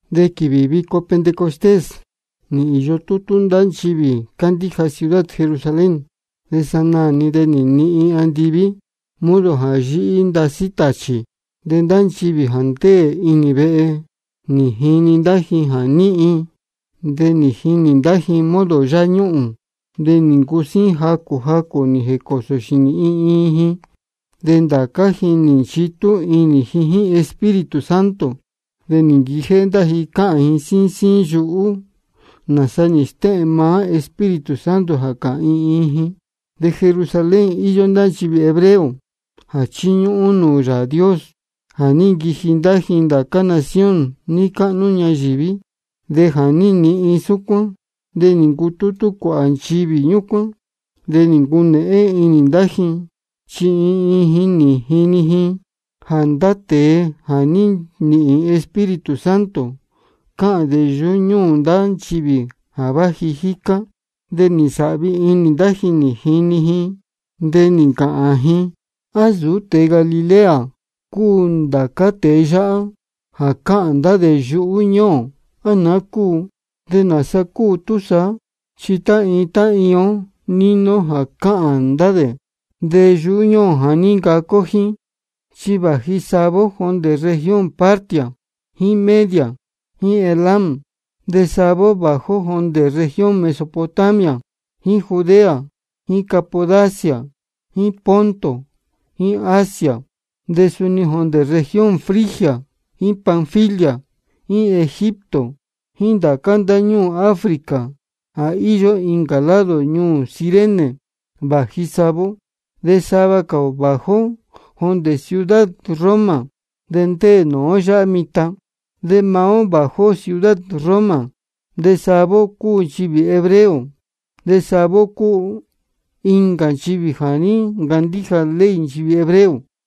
De quīvī vico Pentecostés nī īyo tútú ndá nchivī cándíja ciudad Jerusalén. De sanaā-ni de nī nihin andiví modo jā yíhí ndasí tāchī. De ndá nchivī jā ndéē inī vehe, nī jini ndá ji jā níhin. De nī jinī ndá ji modo yáñuhūn, de nī ncusíín jacū jacū nī jēcōo xīnī iin iin ji. De ndācá ji nī nchitú inī ji jíín Espíritu Santo. De nī nquijéhé ndá ji cáhān ji síín síín yuhú, nāsa nī stéhēn maá Espíritu Santo jā cāhān iin iin ji. De Jerusalén íyó ndá nchivī hebreo jā chíñúhún nūū Yāā Dios jā ní nquiji ndá ji ndācá nación níí cáhnú ñayīví. De jā ní nihin súcuán de nī ncutútú cuāhā nchivī ñúcuán. De nī ncunēhén inī ndá ji, chi iin iin ji nī jini ji jā ndá tēe jā ní nīhīn Espíritu Santo cáhān yuhú ñúū ndá nchivī jā váji jícá. De nī nsāhvi inī ndá ji nī jini ji, de nī ncāhān ji: ¿A nsūú tēe Galilea cúu ndācá tēe yáhá jā cáhān ndá dē yuhú ñúū ō, á naá cúu? ¿De nāsa cúu túsaá? Chi tá iin tá iin ó níni ó jā cáhān ndá dē yuhú ñúū ō jā ní ncacu ó jíín. Chi vāji sava ó jondē región Partia jíín Media jíín Elam. De sava ó vāji ó jondē región Mesopotamia jíín Judea jíín Capadocia jíín Ponto jíín Asia. De suni jondē región Frigia jíín Panfilia jíín Egipto jíín ndācá ndáñúū Africa jā íyó incā lado ñuū Cirene vāji sava ó. De sava cā ō vāji ó jondē ciudad Roma, de ndéē nūú ó yáhá mitan. De maá ó jā váji ó ciudad Roma, de sava ó cúu nchivī hebreo de sava ó cúu incā nchivī jā ní ncandíja ley nchivī hebreo.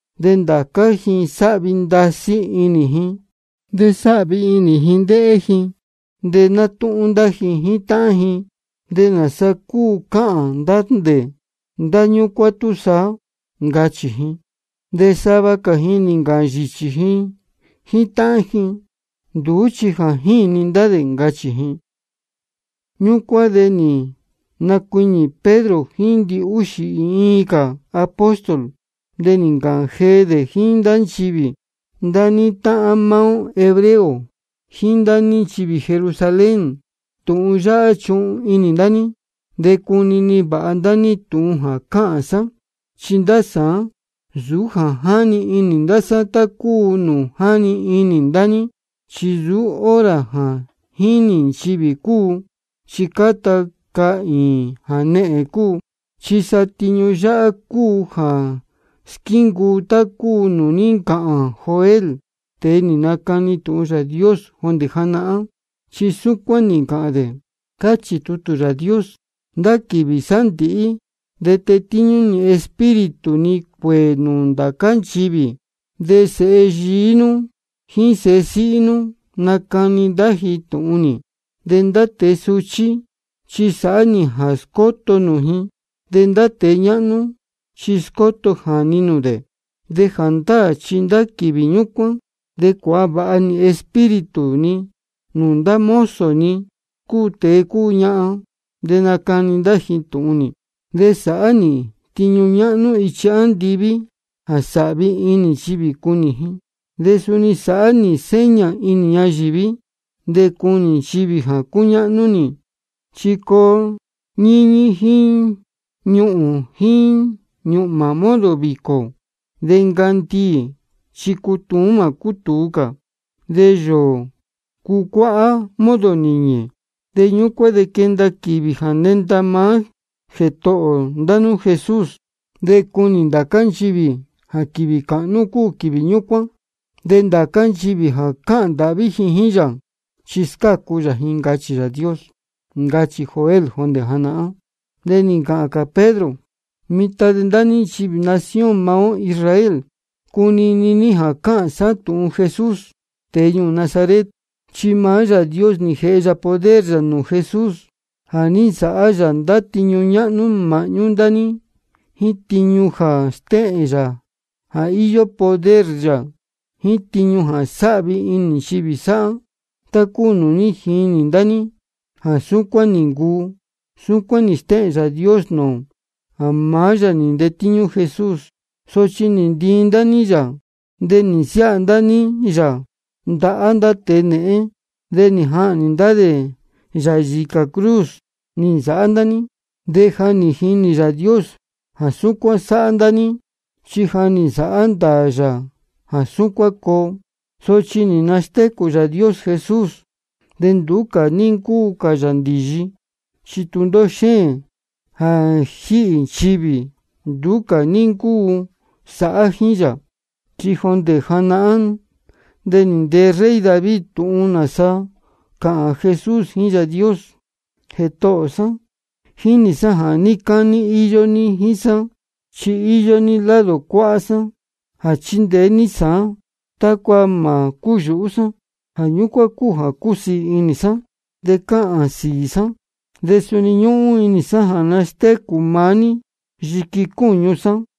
De ndācá ji sáhvi ndasí inī ji de cúnēhén inī ji ndéhé ji. De nátúhún ndá ji jíín táhán ji: ¿De nāsa cúu cáhān ndá dē ndá ñúcuán túsaá? ncachī ji. De sava cā ji nī ncāhān yīchī ji jíín táhán ji: Nduú chi jā jíni ndá dē, ncachī ji. Ñúcuán de nī nacuiñī Pedro jíín ndihúxī iin cā apóstol. De nī ncāhān jee dē jíín ndá nchivī: Ndá ní táhán maá ó hebreo jíín ndá ní nchivī Jerusalén, tūhun yáhá chuhun inī ndá ní de cunini vāha ndá ní tūhun jā cāhān sá. Chi ndá sāán, nsūú jā jíni ndá sá tá cúu nūū jáni inī ndá ní. Chi nsūú hora jā jīni nchivī cúu, chi cáta cahīīn jānehēn cúu. Chi sa tiñu yáhá cúu jā squíncuu tá cúu nūū ní ncāhān Joel, tēe nī nacani tūhun Yāā Dios jondē janahán. Chi súcuán nī ncāhān dē: Cáchī Yāā Dios: Ndá quīvī sándīhí de tetíñú nī Espíritu ni cuēē nūū ndācá nchivī. De sēhe yií nú jíín sēhe síhí nú, nacani ndá ji tūhun nī. De ndá tēe suchí, chi sāhá nī jā scóto nūū ji, de ndá tēe ñáhnú, chi scóto jāni nūū dē. De jāndáā chi ndá quīvī ñúcuán de cuāha vāha nī Espíritu ni nūū ndá mozo ni, cúu tēe cúu ñahan, de nacani ndá ji tūhun nī. De sāhá nī tiñu ñáhnú ichi andiví jā sāhvi inī nchivī cunī ji, de suni sāhá nī seña inī ñayīví de cunī nchivī jā cúñáhnú nī, chi coo nīñī jíín ñuhūn jíín ñūhmā modo vīcō. De ncandiī chi cutuún de mā cútūu cā, de yōō cucuáhá modo nīñī. De ñúcuán de quenda quīvī jā nenda maá Jētohō ndá nú Jesús. De cunī ndācá nchivī jā quīvī cāhnú cuu quīvī ñúcuán. De ndācá nchivī jā cāhān ndāhví ji jíín yā, chi scácu yā ji, ncachī Yāā Dios. Ncachī Joel jondē janahán. De nī ncāhān cā Pedro: Mitan de ndá ní nchivī nación maá ó Israel, cunini ní jā cāhān sá tūhun Jesús, tēe ñuū Nazaret. Chi maá Yāā Dios nī jēhe yā poder yā nūū Jesús jā ní nsāhá yā ndá tiñu ñáhnú māhñú ndá ní jíín tiñu jā stéhēn jā íyó poder yā, jíín tiñu jā sáhvi inī nchivī sáhá, tá cúu nūū ní jinī ndá ní jā súcuán nī ncuu. Súcuán nī stéhēn Yāā Dios nūū ō jā maá yā nī ntetíñú Jesús. Sochi nī ntiin ndá ní yā, de nī nasiáha ndá ní yā ndahá ndá tēe nēhén. De nī jahnī ndá dē yā yīcā cruz nī nsāhá ndá ní. De ja nī jinī Yāā Dios jā súcuán sāhá ndá ní, chi ja nī nsāhá ndāā yā jā súcuán coo. Sochi nī nastécū Yāā Dios Jesús, de nduú ní ncúu cā yā ndīyi, chi tūndóhó xéēn jā jíhī nchivī, nduú cā ní ncúu sāhá jíín yā. Chi jondē janahán de nī ntee rey David tūhun nāsa cāhān Jesús jíín Yāā Dios: Jētohō sá, jínī sá jā níí cání íyó ní jíín sá. Chi íyó ní lado cuáhá sá jā chíndeé ní sāán, tácua mā cúyūhú sá. Jā ñúcuán cúu jā cúsiī inī sá, de cáhān sīī sá. De suni ñúhún inī sá jā nastécū maá ní yiqui cúñu sá.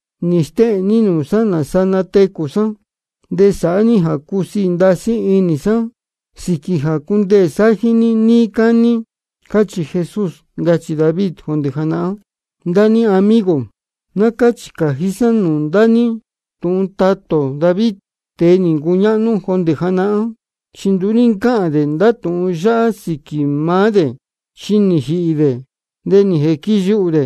Nī stéhēn ní nūū sá nāsa natecū sá de sāhá ní jā cusiī ndasí inī sá sīquī jā cundeē sá jíín ní níí cání. Cachī Jesús, ncachī David jondē janahán. Ndá ní amigo, ná cáchī cājí sá nūū ndá ní tūhun tatā ō David, tēe nī ncuñáhnú jondē janahán, chi nduú ní ncáhān dē ndá tūhun yáhá sīquī maá dē. Chi nī jīhī dē, de nī jīquiyuhū dē.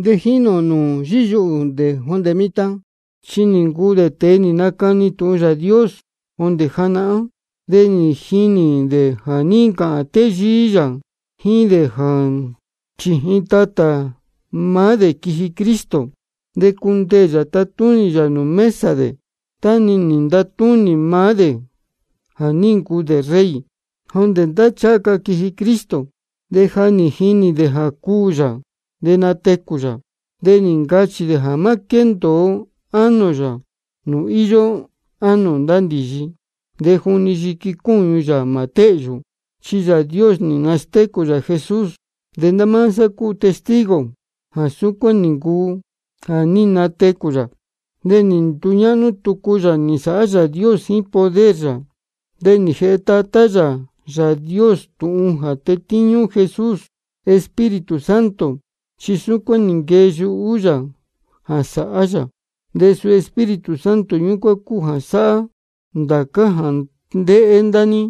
De jínī ō nūū yíyuhū dē jondē mitan. Chi nī ncuu dē tēe nī nacani tūhun Yāā Dios jondē janahán. De nī jinī dē jā ní ncāhān téyíí yā jíín dē jā chījin tatā maá dē quiji Cristo, de cundeē yā tatúnī yā nūū mesa dē tá-ni nī ntatúnī maá dē jā ní ncuu dē rey. Jondē tá ncháha ca quiji Cristo, de ja nī jinī dē jā cuū yā de natecū yā. De nī ncachī dē jā má quéndōo ánō yā nūū íyó ánō ndá ndīyi, de juni yiqui cúñu yā mā téhyū. Chi Yāā Dios nī nastécū yā Jesús, de ndá máá sá cúu testigo jā súcuán nī ncuu jā ní natecū yā. De nī nduñáhnú tucu yā nī nsāhá Yāā Dios jíín poder yā. De nī jēhe Tatá yā Yāā Dios tūhun jā tetíñú Jesús Espíritu Santo, chi súcuán nī nquee yuhú yā jā sāhá yā. De suu Espíritu Santo ñúcuán cúu jā sáhá ndācá jā ndéhé ndá ní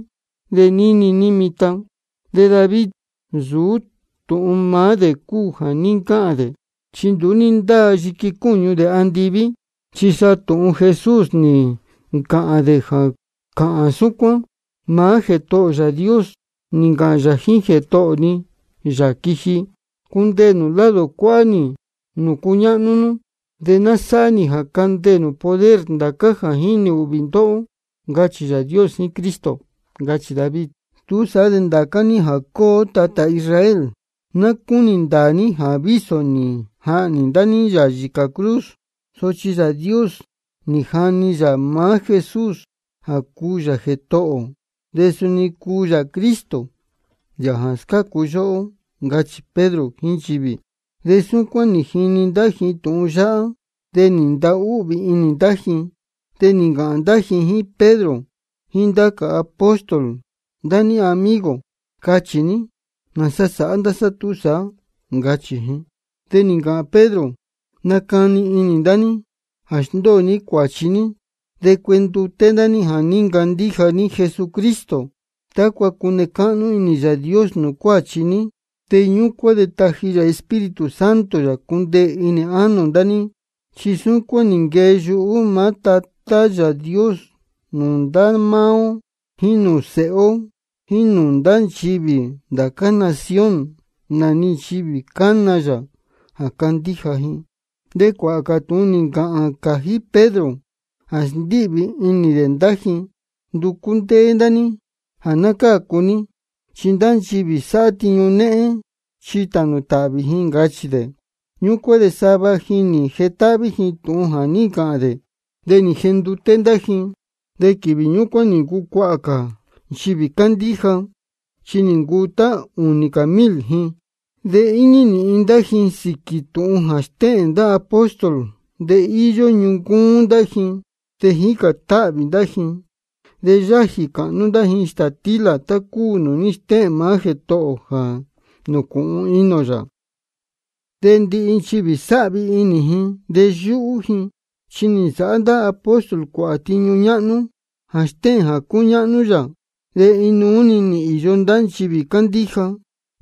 de níni ní mitan. De David nsūú tūhun maá dē cúu jā ní ncāhān dē, chi nduú ní ndáa yiqui cúñu dē andiví. Chi sa tūhun Jesús nī ncāhān dē jā cáhān súcuán: Maá Jētohō ō Yāā Dios nī ncāhān yā jíín Jētohō ni, Yāā jā quiji: Cundeē nū lado cuáhá nī nūū cuñáhnú nú, de ná sáhá nī jā candeē nū poder ndācá jā jínī ūhvī ndóhó, ncachī Yāā Dios jíín Cristo. Ncachī David. Túsaá de ndācá ní jā cúu ó tatā Israel, ná cúnī ndāā ní jā vísō nī jahnī ndá ní yā yīcā cruz, sochi Yāā Dios nī jani yā maá Jesús jā cúu yā Jētohō ō de suni cúu yā Cristo, Yāā jā scácu yóhó, ncachī Pedro jíín nchivī. De súcuán nī jini ndá ji tūhun yáhá, de nī ntahúhvī inī ndá ji. De nī ncāhān ndá ji jíín Pedro jíín ndá cā apóstol: Ndá ní amigo, cachī ní ¿nāsa sāhá ndá sá túsaá? ncachī ji. De nī ncāhān Pedro: Nacani inī ndá ní jā sndóo ní cuāchi ní, de cuenduté ndá ní jā ní ncandíja ní Jesucristo, tácua cune cáhnú inī Yāā Dios nūū cuáchi ní. De ñúcuán de taji yā Espíritu Santo yā cundeē inī ánō ndá ní. Chi súcuán nī nquee yuhú maá Tátā Yāā Dios nūū ndá máá ó jíín nūū séhe ó jíín nūū ndá nchivī ndá cā nación, nā-ni nchivī cana yā jā candíja ji. De cuāhā cā tūhun nī ncāhān cājí Pedro jā sndíhvī inī dē ndá ji: Nducú ndéé ndá ní jā ná cácu ní, chi ndá nchivī sáhá tiñu néhén chi tānū tāhvī ji, ncachī dē. Ñúcuán de sava ji nī jetáhví ji tūhun jā ní ncāhān dē, de nī jenduté ndá ji. De quīvī ñúcuán nī ncucuahā cā nchivī cándíja, chi nī ncuu tá ūnī cā mil ji. De íñí nīhin ndá ji sīquī tūhun jā stéhēn ndá apóstol, de íyó ñuncúún ndá ji, de jícān táhvī ndá ji. De yájī cāhnú ndá ji stātílā tá cúu nūū ní stéhēn maá Jētohō ō jā nūcūhun inī ō yā. De ndihi nchivī sáhvi inī ji de yúhú ji. Chi nī nsāhá ndá apóstol cuāhā tiñu ñáhnú jā stéhēn jā cúñáhnú yā. De inuú-ni nī īyo ndá nchivī cándíja,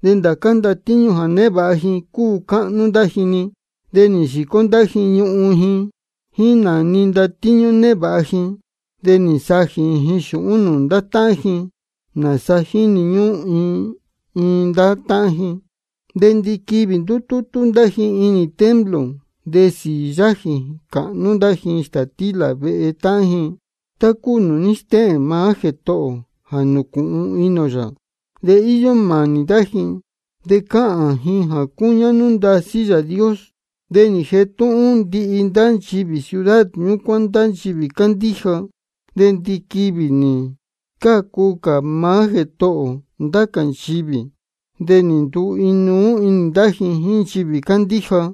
de ndācá ndatíñú jā névāha ji cúu cáhnú ndá ji-ni. De nī yīcó ndá ji ñuhun ji jíín nā-ni ndatíñú névāha ji, de nī nsajī ji xūhún nūū ndá táhán ji, nāsaa jíni ñúhún iin iin ndá táhán ji. De ndiquivī ndútútú ndá ji inī templo. De sīī-ni yájī cāhnú ndá ji stātílā vehe táhán ji, tá cúu nūū ní stéhēn maá Jētohō ō jā nūcūhun inī ō yā. De íyó mānī ndá ji. De cáhān ji jā cúñáhnú ndasí Yāā Dios. De nī jetúhún ndihi ndá nchivī ciudad ñúcuán ndá nchivī cándíja. De ndiquivī nī scácu cā maá Jētohō ō ndá cā nchivī, de nī nduu inuú-ni ndá ji jíín nchivī cándíja.